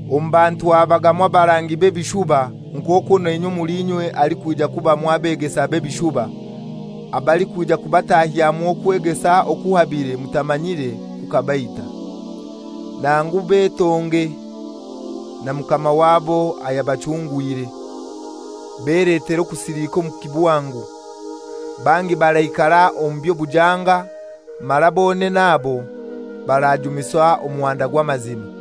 Omu bantu habagamu abarangi b'ebishuba, nk'okwo nainywe omuli inywe halikwija kubamu abegesa b'ebishuba, abalikwija kubatahyamu okwegesa okuhabire mutamanyire kukabaita, nangu betonge na Mukama wabo ayabachungwire, beletere okusilika omu kibwangu. Bangi baraikara omu by'obujanga, mara bonene abo barajumisa Omuhanda gw'Amazima.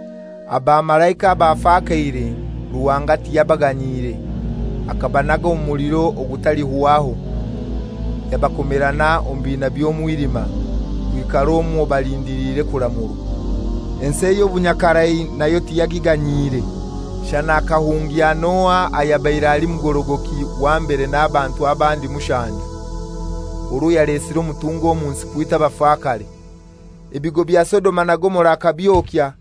Abamalaika abafakaire, Ruhanga tiyabaganyiire. Akabanaga omu muliro ogutalihwaho, yabakomerana omu biina by'omwilima, kwikara omwo balindiliire kuramurwa. Ensi ey'obunyakarai nayo tiyagiganyiire, shana akahungya Noa ayabaire ali mugorogoki wa mbere n'abantu abandi mushanju, orwo yalesire omutunga omu nsi kwita abafakare. Ebigo bya Sodoma na Gomora akabyokya,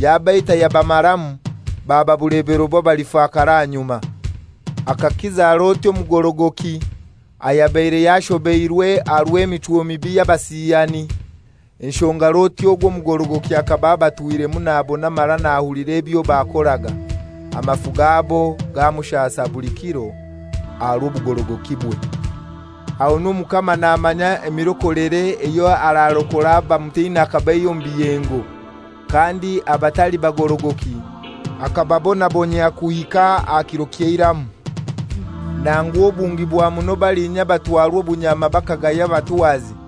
yabaita yabamaramu, baba bulebero bw'abalifakara ahanyuma. Akakiza Loti omugorogoki, ayabaire yashobeirwe aha rw'emichwo mibi y'abasiyani (enshonga Loti ogu omugorogoki akaba abatwiremu nabona mara nahulira ebyo bakoraga, amafu gabo gamushasa buli kiro aha rw'obugorogokibwe). Ahonu Omukama namanya emirokolere eyo ararokora abamutina akabaihya omu biyengo, kandi abatali bagorogoki akababonabonyia kuhika aha kiro ky'eiramu, nangu obungi bwa muno balinya abatwarwa obunyama bakagaya abatwazi.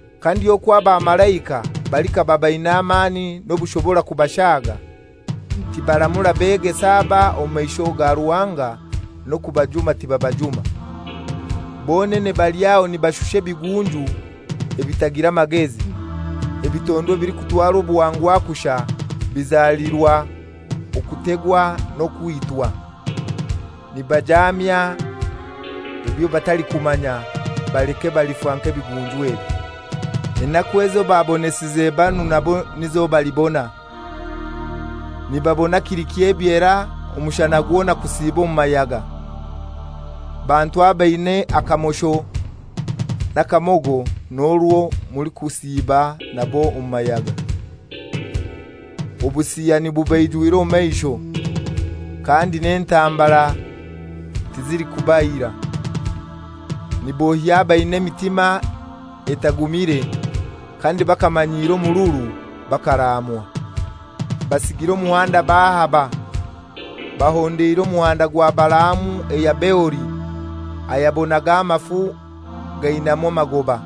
Kandi okwo abamalaika, balikaba baina amani n'obushobora kubashaaga, tibaramura begesa aba omu maisho ga Ruhanga, n'okubajuma tibabajuma. Bonene bali aho nibashusha ebigunju ebitagira magezi, ebitondwa ebilikutwarwa obuhangwa kushai, bizalirwa okutegwa n'okwitwa. Nibajamya ebyo batalikumanya; baleke balifa nk'ebigunju ebyo, enaku ezo babonesize banu nabo nizo balibona. Nibabona kili ky'ebyera omushana gwona kusiiba omu mayaga. Bantu abaina akamosho n'akamogo n'orwo mulikusiiba nabo omu mayaga. Obusiyani bubaijwire omu maisho, kandi n'entambara tizilikubaira. Niboohya abaina emitima etagumire, kandi bakamanyiira omururu. Bakaraamwa! Basigire omuhanda bahaba. Bahondeire omuhanda gwa Balaamu eya Beori ayabonaga amafu gainamu amagoba,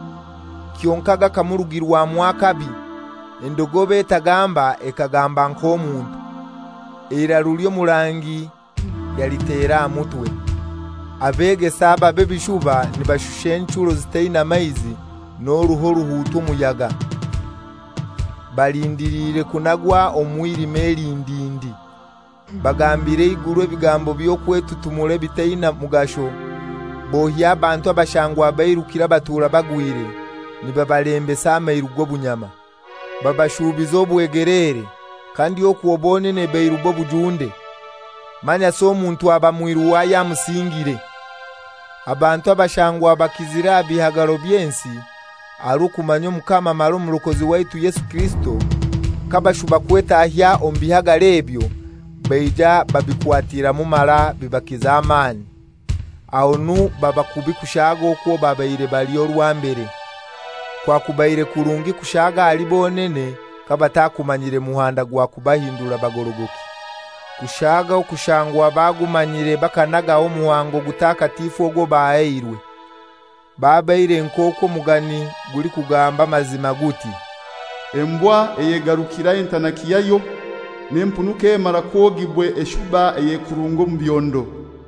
kyonkai gakamurugirwamu akabi. Endogobe etagamba ekagamba nk'omuntu, eiraru ly'omurangi yalitera aha mutwe. Abegesa aba b'ebishuba nibashusha enchuro zitaina maizi n'oruho oruhuutwa omuyaga. Balindiliire okunagwa omu mwilima elindindi. Bagambira eiguru ebigambo by'okwetutumura ebitaina mugasho, boohya abantu ababa bairukire abatuura bagwire, nibabalembesa amairu g'obunyama. Babashuubiza obwegeleere, kandi okwo bonene bairu b'obujunde; manyasi omuntu aba mwiru w'ayamusingire. Abantu abashangwa bakizire aha bihagaro by'ensi aha rw'okumanya Omukama mara Omurokozi waitu Yesu Kirisito, kabashuba kwetahya omu bihagaro ebyo, baija babikwatiramu mara bibakiza amani, ahonu baba kubi kushaaga okwo babaire bali orwa mbere. Kyakubaire kirungi kushaaga ahali bonene kabatakumanyire muhanda gwa kubahindura bagorogoki, kushaaga okushangwa bagumanyire bakanagaho omuhango ogutakatifu ogwo bahairwe. Babaire nk'okwo omugani gulikugamba amazima, guti, «Embwa eyegarukana entanaki yayo, n'empunu k'emara kwogibwa eshuba eyekurunga omu byondo.»